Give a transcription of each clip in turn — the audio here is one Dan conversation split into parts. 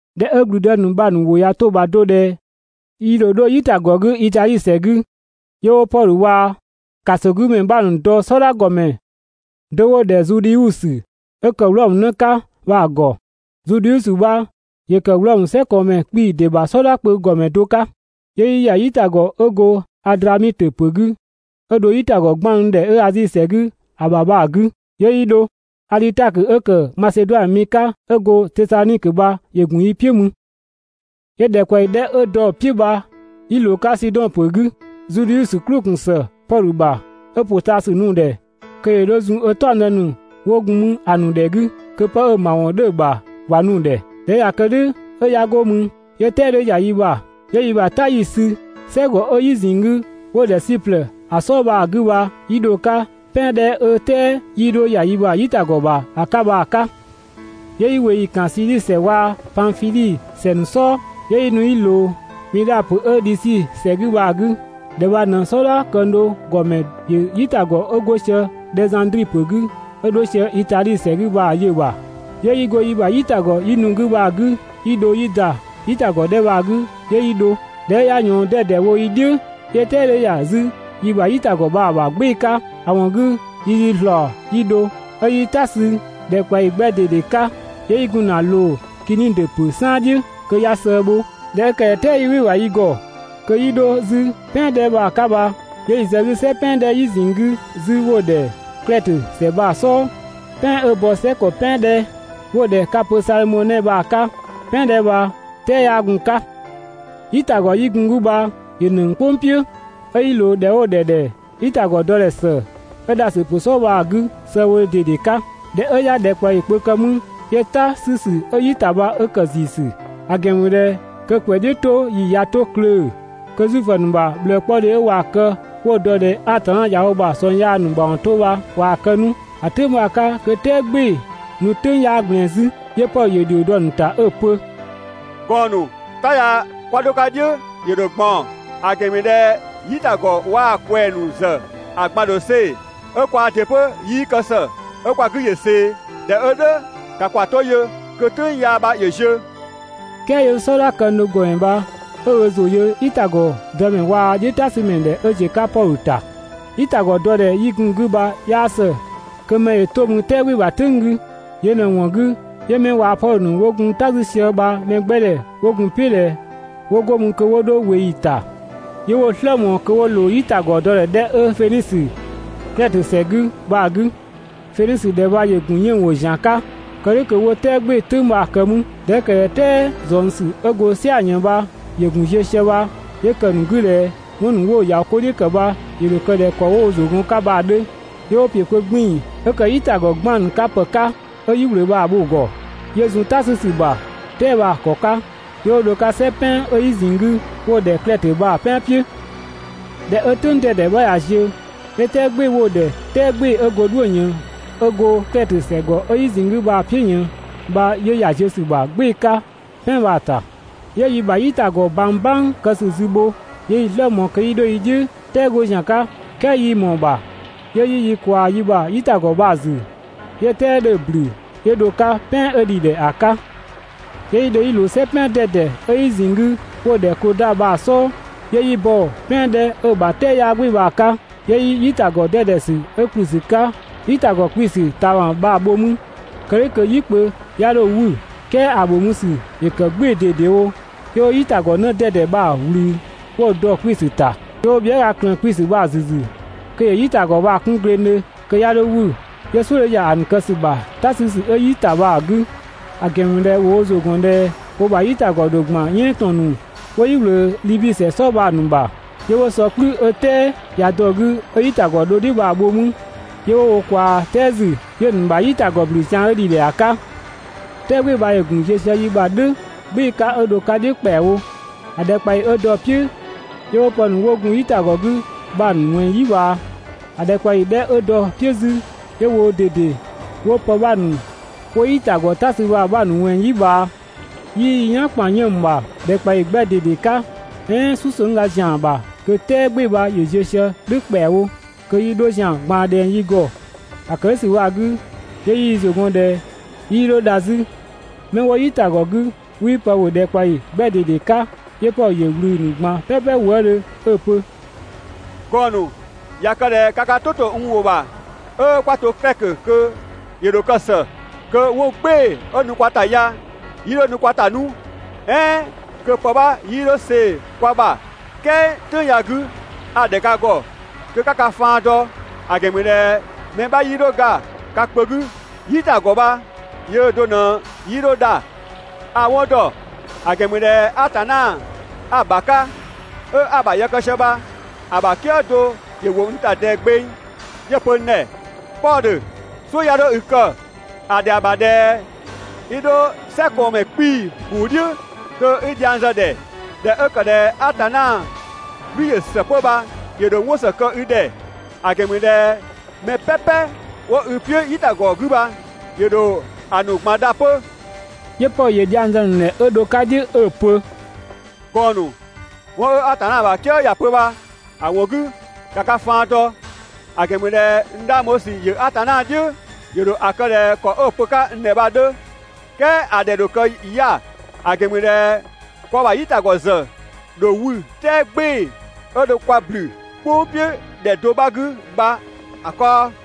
꞊Dhɛ 'ö ‑gblüdë ‑nu bha‑ ‑nu ‑wʋ ꞊ya 'to‑ ‑bha do ꞊dhɛ yi ‑dho 'dho "yitagɔ 'gü Itadhi ‑sɛ 'gü, 'yö 'wo Pɔdhö waa‑ ‑kasogümɛ 'bha ‑nu dɔ "sɔdha ‑gɔmɛ do 'wo‑ ‑dhɛ Zudhiusö 'ö ‑kë Wlɔmö 'në 'ka bha‑ ‑gɔ. Zudhiusö bha ‑yö ‑kë Wlɔmö "sɛkɔɔnmɛ 'kpii‑ ‑dɩ ‑bha "sɔdha kpö ‑gɔmɛ do 'ka. 'Yö 'yi ‑ya "yitagɔ 'ö go Adramitö ‑pö 'gü 'ö dho "yitagɔ 'gbaannu ‑dhɛ 'ö Azi ‑sɛ 'gü ‑a ‑bha bha‑ 'gü 'yö 'yi dho. Adhitakö 'ö ‑kë Maseduanö mi 'ka 'ö go Tesadhonikö bha ‑yö ‑gun yi "piʋ̈ mü. 'Yö ‑dhɛkpaɔyi 'dhɛ 'ö dɔ‑ "piʋ̈ bha 'yi ꞊loo‑ 'ka Sidɔn ‑pö 'gü. Zudhiusö "klʋ‑ ‑gun ‑së Pɔdhö ‑bha 'ö ‑pʋtaasü nu‑ ‑dhɛ kö ‑yö 'dho zun ö "taɔngdë ‑nu 'wo gun mü ‑a ‑nu ‑dhɛ 'gü kö 'pë 'ö‑ ‑mawɔn 'dhö‑ ‑bha ‑wa nu‑ ‑dhɛ. ꞊Dhɛ 'ö ꞊ya kë "dhʋ̈ 'ö 'ya go mü, 'yö "tɛɛ 'dhö ‑ya yi ‑bha. 'Yö yi ‑bha "ta 'yi‑ sü "sɛgɔ 'ö "yi ꞊zinng 'gü 'wo‑ ‑dhɛ Siplë ‑a "sɔɔ bha‑ 'gü bha, 'yi dho‑ 'ka "pɛan 'dhɛ 'ö "tɛɛ 'yii dho ‑ya yi ‑bha "yitagɔ ‑bha ‑a 'ka bha‑ 'ka. 'Yö yi ꞊weeyi ‑kan Sidhisi ‑sɛ waa‑ Panfidhi ‑sɛ ‑nu "sɔɔ, 'yö 'yi nu 'yi ꞊loo Midha ‑pö 'ö Dhisi ‑sɛ 'gü bha‑ 'gü. ‑Dhɛ bha ꞊në "sɔdha këng do ‑gɔmɛ ‑yö "yitagɔ 'ö 'go sië Dhɛzandri ‑pö 'gü 'ö 'dho sië Itadhi ‑sɛ 'gü bha‑ yö‑ ‑bha, 'yö 'yi go yi ‑bha "yitagɔ 'yi nu‑ 'gü bha‑ 'gü 'yi dho 'yi ‑da "yitagɔ 'dhɛ bha‑ 'gü 'yö 'yi dho. ꞊Dhɛ 'ö 'ya ꞊yɔɔn 'dɛdɛ wo yi "dhiʋ̈, 'yö "tɛɛ 'dhö ‑ya 'zü yi ‑bha "yitagɔ bha‑ ‑bha "gbɩɩ‑ 'ka. ‑A ‑wɔn 'gü yi yi ‑zlaɔ 'yi dho. 'Ö 'yi "ta sü ‑dhɛkpaɔyi 'gbɛ ꞊dede 'ka, 'yö 'yi gun ‑na ꞊loo Kinidö ‑pö "saan "dhiʋ̈ kö 'ya sëë bho. ꞊Dhɛ 'ö ‑kë ꞊dhɛ "tɛɛ 'yii "wɩ‑ ‑bha yi ‑gɔ kö 'yi 'dho 'zü "pɛan 'dhɛ bha‑ 'ka bha, 'yö 'yi‑ zë‑ 'gü "sɛ "pɛan 'dhɛ "yi ꞊zinng 'gü 'zü, 'wo‑ ‑dhɛ Klɛtö ‑sɛ bha‑ "sɔɔ, "pɛan 'ö bɔ "sɛ ‑kɔ "pɛan 'dhɛ 'wo‑ ‑dhɛ 'Kapö Salmɔnɛ bha‑ 'ka. "Pɛan 'dhɛ bha "tɛɛ 'yaa gun‑ 'ka. "yitagɔ 'yi gun‑ 'gü bha ‑yö ‑nëng "kpʋng "piʋ̈, 'ö 'yi ꞊loo ‑dhɛ 'wo‑ ‑dhɛ ‑dhɛ «"yitagɔ dɔdhɛ ‑së» 'ö Dhasö ‑pö "sɔɔ bha‑ 'gü sëëbhodhe ꞊dede 'ka. ꞊Dhɛ 'ö 'ya ‑dhɛkpaɔyi kpö kë 'mü, 'yö "ta 'sü ‑sü 'ö "yi ‑ta bha 'ö ‑kë ‑ziisü, ‑a ‑gɛn ‑mü ꞊dhɛ kö ‑kwɛ "dhiʋ̈ 'to ‑yi ꞊ya 'to klöö‑, kö Zuifö ‑nu ‑bha ꞊bhlëëkpɔdhe 'ö ꞊waa‑ kë 'wo‑ dɔ ꞊dhɛ Atanna ꞊ya wo ‑bha ꞊sɔng yaa ‑nu ‑mawɔn 'to bha ꞊waa‑ kë 'nu. (‑A "tʋ̈ng bha‑ 'ka kö "tɛɛ "gbɩɩ‑ nu "tʋ̈ng 'yaa ꞊gblɛɛn 'zü). 'Yö Pɔdhö ‑yö ‑dhio dɔ‑ ‑nu ‑ta 'ö‑ pö: «Gɔɔn‑ ‑nu, "ta ya 'kwa 'dho‑ 'ka "dhiʋ̈ ‑yö ‑dho ꞊gbaɔn, ‑a ‑gɛn ‑mü ꞊dhɛ "yitagɔ waa‑ ꞊kwɛɛ‑ ‑nu ‑zë ‑a ꞊gban ‑dho see‑, 'ö kwaa ‑dɩ 'pö 'yii kë ‑së 'ö kwa 'gü ‑yö ꞊see, (꞊dhɛ 'ö "dhʋ̈, ‑ka ‑kwa 'to yö kö "tʋ̈ng yaa bha ‑yö ziö).» "Kɛɛ 'yö "sɔdha këng do ‑gɔmɛ bha 'ö ö ‑zʋ yö "yitagɔ dëmɛ waa‑ "dhiʋ̈ "ta 'sü ‑mɛ ‑dhɛ 'ö ziö‑ 'ka Pɔdhö ‑ta. "Yitagɔ dɔdhɛ 'yi gun‑ 'gü bha 'yaa ‑së kö mɛ ‑yö 'to mü "tɛɛ "gbɩɩ‑ bha‑ "tʋ̈ng 'gü. Yö ꞊në‑ ‑wɔn 'gü 'yö 'mɛ waa‑ Pɔdhö ‑nu ‑wo gun "ta 'sü sië bha mɛgbɛdhɛ 'wo gun‑ "piʋ̈ ꞊dhɛ 'wo 'go mü kö 'wo 'dho ꞊weeyi ‑ta. 'Yö 'wo‑ "slë ꞊mɔɔ kö 'wo ꞊loo "yitagɔ dɔdhɛ 'dhɛ 'ö Fenisö, Klɛtö ‑sɛ 'gü bha‑ 'gü. Fenisö ‑dhɛ bha ‑yö ‑gun 'yënng‑ ‑pö ‑zian 'ka. Kë "dhʋ̈ kö 'wo "tɛɛ "gbɩɩ‑ "tʋ̈ng bha‑ kë mü. ꞊Dhɛ 'ö ‑kë ꞊dhɛ "tɛɛ ꞊zɔngsü 'ö go "sia‑ ꞊yën bha ‑yö ‑gun ziö sië bha, 'yö ‑kë ‑nu 'gü ꞊dhɛ 'wɔn ‑nu 'wo‑ ‑ya 'ko "dhiʋ̈ ‑kë bha ‑yö ‑dho kë ꞊dhɛ ‑kɔ 'wo wo ‑zʋ gɔn‑ 'ka bha‑ 'dhö. 'Yö 'wo ‑piö kpö 'gbiin‑ 'ö ‑kë "yitagɔ 'gbaannu 'ka ‑pë 'ka 'ö "yi ꞊wlöö bha‑ bho‑ ‑gɔ, 'yö zun "ta 'sü ‑sü ‑bha "tɛɛ bha‑ ‑kɔ 'ka, 'yö 'wo dho‑ 'ka "sɛ "pɛan 'ö "yi ꞊zinng 'gü 'wo‑ ‑dhɛ Klɛtö bha‑ "pɛan "piʋ̈. ꞊Dhɛ 'ö "tʋ̈ng 'dɛdɛ 'bha ꞊ya ziö, 'yö "tɛɛ "gbɩɩ‑ 'wo‑ ‑dhɛ «"tɛɛ "gbɩɩ‑ 'ö go "dhuʋ̈‑ ꞊yën» 'ö go Klɛtö ‑sɛgɔ 'ö "yi ꞊zinng 'gü bha‑ "piʋ̈ ꞊yën bha 'yö ‑ya ziö ‑sü ‑bha "gbɩɩ‑ 'ka "pɛan bha‑ ‑ta. 'Yö yi ‑bha "yitagɔ ꞊bang "bang kë ‑sü zü bho. 'Yö 'yi‑ "slë ꞊mɔɔ kö 'yi 'dho yi "dhiʋ̈ "tɛɛ 'go ‑zian 'ka, "kɛɛ 'yii ꞊mɔɔ‑ ‑bha. 'Yö 'yi yi ꞊kwaa yi ‑bha "yitagɔ bha‑ ‑zü 'yö "tɛɛ 'dhö‑ ‑blü 'yö dho‑ 'ka "pɛan 'ö ‑dhi ‑dhɛ ‑a 'ka. 'Yö 'yi dho 'yi ꞊loo "sɛ "pɛan 'dɛdɛ 'ö "yi ꞊zinng 'gü 'wo‑ ‑dhɛ Kloda bha‑ "sɔɔ. 'Yö 'yi bɔ‑ "pɛan 'dhɛ 'ö‑ ‑bha "tɛɛ 'yaa "gbɩɩ‑ bha‑ 'ka, 'yö 'yi "yitagɔ 'dɛdɛ ‑sü 'ö ‑kë ‑kplü ‑sü 'ka "yitagɔ 'kpiisü ꞊taama bha‑ bho 'mü kë "dhʋ̈ kö "yi kpö 'ya 'dho‑ 'wü. "Kɛɛ ‑a ‑bho mü ‑sü ‑yö ‑kë "gbɩɩ‑ ꞊dedewo. 'Yö 'wo "yitagɔ 'në 'dɛdɛ bha‑ ꞊wlü 'wo‑ dɔ‑ 'kpiisü ‑ta, 'yö 'wo bhiëga ꞊klëën‑ 'kpiisü bha‑ ‑zü ‑zü kö ‑yö "yitagɔ bha‑ 'kun glengdhö (kö 'ya 'dho 'wü). 'Yö "suʋ̈ 'dhö ‑ya ‑nu kë ‑sü ‑bha "ta 'sü ‑sü 'ö "yi ‑ta bha‑ 'gü, ‑a ‑gɛn ‑mü ꞊dhɛ ‑wo wo ‑zʋ ‑gɔn ꞊dhɛ wo ‑bha "yitagɔ ‑dho ‑gban "yɛɛn ‑tɔn ‑nu 'wo "yi ꞊wlöö Dhibi ‑sɛ "sɔɔ bha‑ ‑nu ‑bha. 'Yö 'wo sɔ "kplü 'ö "tɛɛ ꞊ya dɔ‑ 'gü 'ö "yitagɔ dho "dhiʋ̈ bha‑ bho 'mü. 'Yö 'wo ꞊kwaa "tɛɛ ‑zü 'yö‑ ‑nu ‑bha "yitagɔ ‑blü zian 'ö ‑dhi ‑a 'ka. "Tɛɛ "gbɩɩ‑ bha ‑yö ‑gun ziö sië yi ‑bha "dhʋ̈ "gbɩɩ‑ 'ka 'ö dho‑ 'ka "dhiʋ̈ ‑kpɛawo. ‑A ‑dhɛkpaɔyi 'dhɛ 'ö dɔ‑ "piʋ̈, 'yö 'wo pë ‑nu 'wo gun "yitagɔ 'gü bha‑ 'bha ‑nu ꞊wɛnng "yi ꞊bhaa. ‑A ‑dhɛkpaɔyi 'dhɛ 'ö dɔ‑ "piʋ̈ 'zü, 'yö woo‑ ꞊dede 'wo pë 'bha ‑nu 'wo "yitagɔ "ta sü bha‑ 'bha ‑nu ꞊wɛnng "yi ꞊bhaa. 'Yii yi "yan ‑kpan 'yënng‑ ‑bha ‑dhɛkpaɔyi 'gbɛ ꞊dede 'ka, "ɛɛn "susëngga ‑zian ‑bha kö "tɛɛ "gbɩɩ‑ bha ‑yö ziö sië "dhʋ̈ ‑kpɛawo (kö yi 'dho ‑zian ꞊gbaan ꞊dhɛng yi ‑gɔ ‑a ‑kë "dhʋ̈ ‑sü bha‑ 'gü). 'Yö 'yi yi ‑zʋ ‑gɔn ꞊dhɛ 'yii dho dha 'zü. 'Mɛ 'wo "yitagɔ 'gü 'wii pë ‑bhö ‑dhɛkpaɔyi 'gbɛ ꞊dede 'ka. 'Yö Pɔdhö ‑yö ꞊wlü‑ ‑nu ꞊gban "pɛpɛ wëëdhö 'ö‑ pö: «Gɔɔn‑ ‑nu, ꞊ya kë ꞊dhɛ ka ka "tʋ ‑to n ‑wʋ ‑bha 'ö 'kwa to Klɛtö kö ‑yö ‑dho kë ‑së. Kö 'wɔn "gbɩɩ‑ 'ö nu kwa ‑ta ya 'yii 'dho nu kwa ‑ta 'nu, "ɛɛn kö pë 'bha 'yii dho see‑ kwa ‑bha. "Kɛɛ "tʋ̈ng ya‑ 'gü a‑ ‑dhɛ ka ‑gɔ kö 'ka ka faan dɔ, ‑a ‑gɛn ‑mü ꞊dhɛ mɛ 'bha 'yii dho ga ka kpö 'gü, "yitagɔ bha yöö do ꞊në 'yii 'dho dha. A‑ 'wɔn ‑dɔ, ‑a ‑gɛn ‑mü ꞊dhɛ Atanna 'a‑ ‑bha 'ka 'ö 'a‑ ‑bha yë kë sië bha‑ ‑bha "kië do ‑yö ‑wo n ‑ta ꞊dɛɛ gbeng, 'yö‑ pö n ‑dhɛ: «Pɔdhö, "suʋ̈ 'ya 'dho i kë, ‑a ‑dhɛa ‑bha ꞊dhɛ 'i 'dho "sɛkɔɔnmɛ 'kpii‑ ‑kuu "dhiʋ̈ (kö 'i dhiang zë‑ ‑dhɛ). ꞊Dhɛ 'ö ‑kë ꞊dhɛ Atanna "gblü ‑yö ‑së 'pö bha, ‑yö ‑dho 'wɔn ‑së kë i ‑dhɛ, ‑a ‑gɛn ‑mü ꞊dhɛ mɛ "pɛpɛ 'wo i "piʋ̈ "yitagɔ 'gü bha ‑yö ‑dho ‑a ‑nu ꞊gban dha 'pö.» 'Yö Pɔdhö ‑yö dhiang zë‑ ‑nu ‑dhɛ 'ö dho‑ 'ka ö "dhiʋ̈ 'ö‑ pö: «Gɔɔn‑ ‑nu, 'wɔn 'ö Atanna ‑bha "kië ‑ya pö bha‑ ‑wɔn 'gü ‑ka ka faan dɔ, ‑a ‑gɛn ‑mü ꞊dhɛ n 'dhang bho ‑sü ‑yö Atanna "dhiʋ̈, ‑yö ‑dho ‑a kë ꞊dhɛ ‑kɔ 'ö‑ pö‑ 'ka n ‑dhɛ bha‑ 'dhö. "Kɛɛ ‑a ‑dhɛ ‑dho kë 'ya‑, ‑a ‑gɛn ‑mü ꞊dhɛ kwa ‑bha "yitagɔ ‑zë ‑dho 'wü "tɛɛ "gbɩɩ‑ 'ö dho kwa ‑blü "kpʋng "piʋ̈ ‑dhɛ do 'bha 'gü bha‑ kaɔ.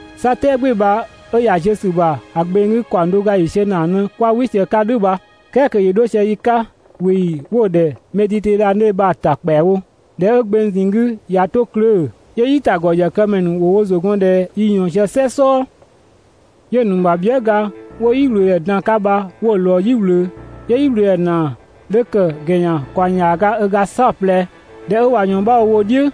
'Sa "tɛɛ "gbɩɩ‑ bha 'ö ‑ya ziö ‑sü ‑bha ‑a gbeng 'gü ‑kaɔng do ga ‑yiisiö ‑naa ꞊në 'kwa "wɩ sië‑ 'ka "dhʋ̈ bha, "kɛɛ kö ‑yö 'dho sië yi 'ka ꞊weeyi 'wo‑ ‑dhɛ Meditedhane bha‑ ‑ta ‑kpɛawo. ꞊Dhɛ 'ö gbeng ꞊zinng 'gü ꞊ya 'to klöö‑, 'yö "yitagɔ ‑yëkëmɛ ‑nu 'wo wo ‑zʋ gɔn ꞊dhɛ yi ꞊yɔɔn sië "sɛ "sɔɔ. 'Yö‑ ‑nu ‑bha bhië" ga 'wo "yi ꞊wlöö ‑dhɛ dan‑ 'ka bha 'wo‑ ꞊lɔɔ "yi ꞊wlöö, 'yö "yiwlöödhɛ ‑naa 'dhö ‑kë ‑gɛnyan ‑kaɔng ‑yaaga ö ga "saɔplɛ. ꞊Dhɛ 'ö ꞊wa ꞊yɔɔn 'bha wo wo "dhiʋ̈,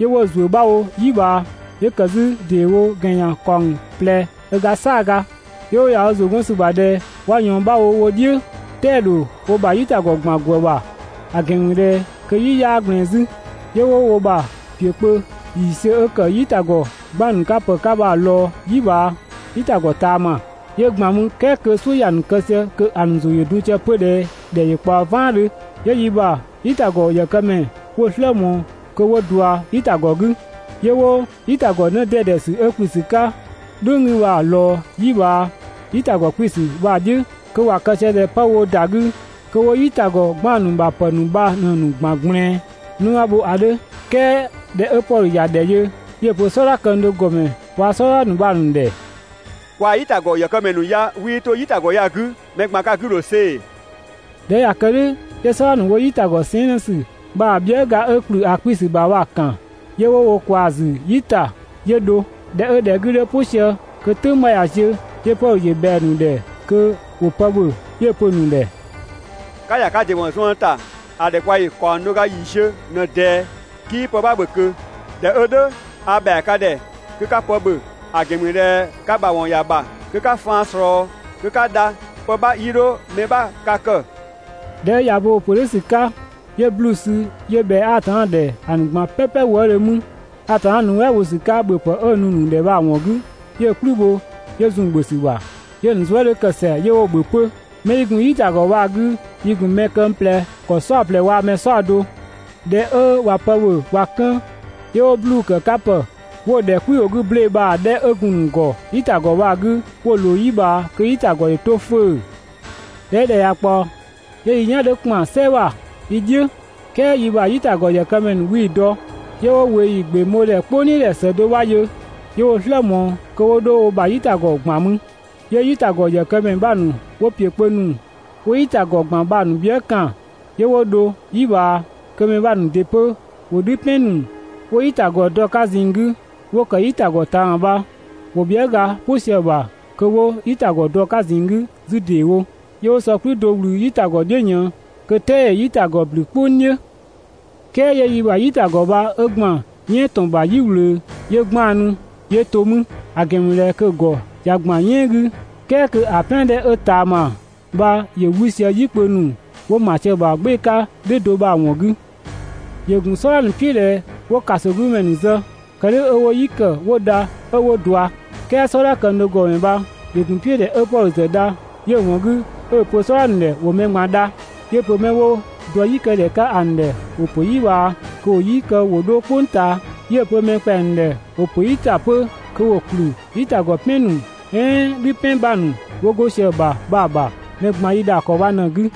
'yö 'wo‑ ‑zuö 'bha wo "yi ꞊bhaa, 'yö ‑kë 'zü ‑deewo ‑gɛnyan ‑kaɔng ꞊plɛ ö ga "saaga. 'Yö 'wo ‑ya wo ‑zʋ 'gɔn ‑sü ‑bha ꞊dhɛ 'wa ꞊yɔɔn 'bha wo wo "dhiʋ̈, "tɛɛ‑ ‑dho ‑nu ‑bha "yitagɔ ‑gban ‑gwë ‑bha, ‑a ‑gɛn ‑mü ꞊dhɛ kö "yi 'yaa ꞊gblɛɛn 'zü. 'Yö 'wo wo ‑bha ‑piö kpö ‑yiisiö 'ö ‑kë "yitagɔ 'gbaannupë 'ka bha‑ ‑nu ꞊lɔɔ "yi ꞊bhaa "yitagɔ ꞊taama, 'yö ‑gban mü, "kɛɛ kö "suʋ̈ ‑ya ‑nu kë sië kö ‑a ‑nu ‑zʋ ‑yö dun sië 'pö ꞊dhɛ ‑dhɛ ‑yö ꞊kpaɔ "vaandhö. 'Yö yi ‑bha "yitagɔ ‑yëkëmɛ ‑nu 'wo‑ "slë ꞊mɔɔ kö 'wo ꞊dua "yitagɔ 'gü, 'yö 'wo "yitagɔ 'në 'dɛdɛ ‑sü 'ö‑ 'kpiisü ‑ta "dhʋ̈ng 'gü bha‑ ꞊lɔɔ "yi ꞊bhaa "yitagɔ 'kpiisü bha‑ "dhiʋ̈, kö ‑wa kë sië ꞊dhɛ 'pë woo ‑da 'gü kö 'wo "yitagɔ 'gbaannu ‑bha ‑pë ‑nu bha ꞊në‑ ‑gban ꞊gblɛɛn 'në 'bha bho ‑a 'dhö. "Kɛɛ ꞊dhɛ 'ö Pɔdhö ‑ya ‑dhɛ yö, 'yö‑ pö "sɔdha këng do ‑gɔmɛ waa‑ "sɔdha ‑nu bha‑ ‑nu ‑dhɛ: «Kwaa‑ "yitagɔ ‑yëkëmɛ ‑nu ya 'wii 'to "yitagɔ ya‑ 'gü, mɛ ꞊gban ka 'gü ‑dho see‑.» ꞊Dhɛ 'ö ꞊ya kë "dhʋ̈, 'yö "sɔdha ‑nu 'wo "yitagɔ sɛɛn" 'në ‑sü bha‑ bhië" ga 'ö ‑kplü ‑a 'kpiisü ‑bha bha‑ ‑kan 'yö 'wo ꞊kwaa‑ ‑zü "yi ‑ta 'yö dho. ꞊Dhɛ 'ö ‑dhɛ 'gü 'dhö "pʋ sië kö "tʋ̈ng bha ꞊ya ziö, 'yö Pɔdhö ‑yö ꞊bhɛa‑ ‑nu ‑dhɛ kö ‑wo pë ‑bhö. 'Yö‑ pö‑ ‑nu ‑dhɛ: «'Ka ‑ya ka ‑dɩ ‑wɔn zuën ‑ta ‑a ‑dhɛkpaɔyi ‑kaɔng do ga ‑yiisiö ꞊në ꞊dɛɛ, 'kii pë 'bha ‑bhö ꞊kö. ꞊Dhɛ 'ö "dhʋ̈ a ‑bhɛa ka ‑dhɛ kö 'ka pë ‑bhö, ‑a ‑gɛn ‑mü ꞊dhɛ ka ‑mawɔn ‑ya ‑bha kö 'ka faan ꞊slɔɔ kö 'ka dha. Pë 'bha 'yii 'dho mɛ 'bha ka kë.» ꞊Dhɛ 'ö ꞊ya bo‑ pö "dhʋ̈ ‑sü 'ka, 'yö 'bluu‑ sü 'yö ꞊bhɛa Atanna ‑dhɛ ‑a ‑nu ꞊gban "pɛpɛ wëëdhö mü, Atanna nuɛ" bho ‑sü 'ka ‑bhöpë 'ö‑ nu‑ ‑nu ‑dhɛ bha‑ ‑wɔn 'gü, 'yö‑ "kplü bho, 'yö zun‑ ‑bhö ‑sü ‑bha. 'Yö‑ ‑nu zuë" 'dhö ‑kë ‑sɛa 'yö 'wo‑ ‑bhö 'pö. 'Mɛ 'yi gun "yitagɔ bha‑ 'gü, yi ‑gun mɛ këng ꞊plɛ ‑kɔ "saɔplɛ waa‑ mɛ "saɔdo. ꞊Dhɛ 'ö ꞊wa pë ‑bhö ꞊wa 'kën, 'yö 'wo 'bluu‑ ‑kë 'ka ‑pë 'wo‑ ‑dhɛ "kwi ‑wʋ 'gü ble bha‑ 'dhɛ 'ö gun‑ ‑nu ‑gɔ "yitagɔ 'gü bha‑ ꞊loo "yi ꞊bhaa kö "yitagɔ ‑yö 'to 'fʋ̈ʋ̈‑. ꞊Dhɛ 'ö ‑dhɛ ꞊ya ꞊kpaɔ, 'yö yi "yan 'dhö ‑kpan "sɛ ‑bha yi "dhiʋ̈, "kɛɛ yi ‑bha "yitagɔ ‑yëkëmɛ ‑nu 'wii‑ dɔ. 'Yö 'wo ꞊weeyi ‑gbeng bho ‑dhɛ "kpʋng "dhiʋ̈ ‑dhɛ ‑së do 'bha yö. 'Yö 'wo‑ "slë ꞊mɔɔ kö 'wo 'dho wo ‑bha "yitagɔ ‑gban mü. 'Yö "yitagɔ ‑yëkëmɛ 'bha ‑nu 'wo ‑piö kpö ‑nu 'wo "yitagɔ ‑gban bha‑ ‑nu bhië" ‑kan 'yö 'wo dho "yi ꞊bhaa, kö mɛ 'bha ‑nu ‑dɩ 'pö ‑wo "dhü "pɛn ‑nu 'wo "yitagɔ dɔ‑ 'ka ꞊zinng 'gü 'wo ‑kë "yitagɔ ꞊taama bha, ‑wo bhiëga "pʋ sië‑ ‑bha kö ‑wo "yitagɔ dɔ‑ 'ka ꞊zinng 'gü 'zü ‑deewo. 'Yö 'wo sɔ "kplü do ꞊wlü "yitagɔ "dhiʋ̈ ꞊yën, kö "tɛɛ ‑yö "yitagɔ ‑blü "kpʋng "dhiʋ̈. "Kɛɛ 'yö yi ‑bha "yitagɔ bha 'ö ‑gban "yɛɛn ‑tɔn bha "yi ꞊wlöö 'yö 'gbaannu, 'yö to mü; ‑a ‑gɛn ‑mü ꞊dhɛ kö‑ ‑gɔ ꞊ya ‑gban "yɛɛn 'gü, "kɛɛ kö ‑a "pɛan 'dhɛ 'ö ꞊taama bha ‑yö 'wü sië "yikpö ‑nu 'wo ‑ma sië‑ ‑bha "gbɩɩ‑ 'ka "dhʋ̈ do bha‑ ‑wɔn 'gü. ‑Yö ‑gun "sɔdha ‑nu "piʋ̈ ꞊dhɛ 'wo ‑kasogümɛ ‑nu zë, kë "dhʋ̈ 'ö 'wo "yi ‑kë 'wo dha 'ö 'wo ꞊dua. "Kɛɛ "sɔdha këng do ‑gɔmɛ bha ‑yö ‑gun "piʋ̈ ꞊dhɛ 'ö Pɔdhö ‑zë dha, 'yö‑ ‑wɔn 'gü 'ö‑ pö‑ ‑nu ‑dhɛ ‑wo mɛ ꞊gban dha. 'Yö‑ pö 'mɛ 'wo dɔ "yi kë ‑dhɛ 'ka ‑a ‑nu ‑dhɛ ‑wo ‑pö "yi ꞊bhaa kö ‑wo "yi kë ‑wo 'dho "kpʋng ꞊taa. 'Yö‑ pö mɛ ‑kpɛa ‑nu ‑dhɛ ‑wo ‑pö "yi ‑ta 'pö kö ‑wo ‑kplü "yitagɔ "pɛn ‑nu "ɛɛn "dhü "pɛn 'bha ‑nu 'wo 'go sië‑ 'gü bha‑ ‑nu ‑bha. Mɛ ꞊gban yi ‑dha ‑kɔ bha ꞊në‑ 'gü.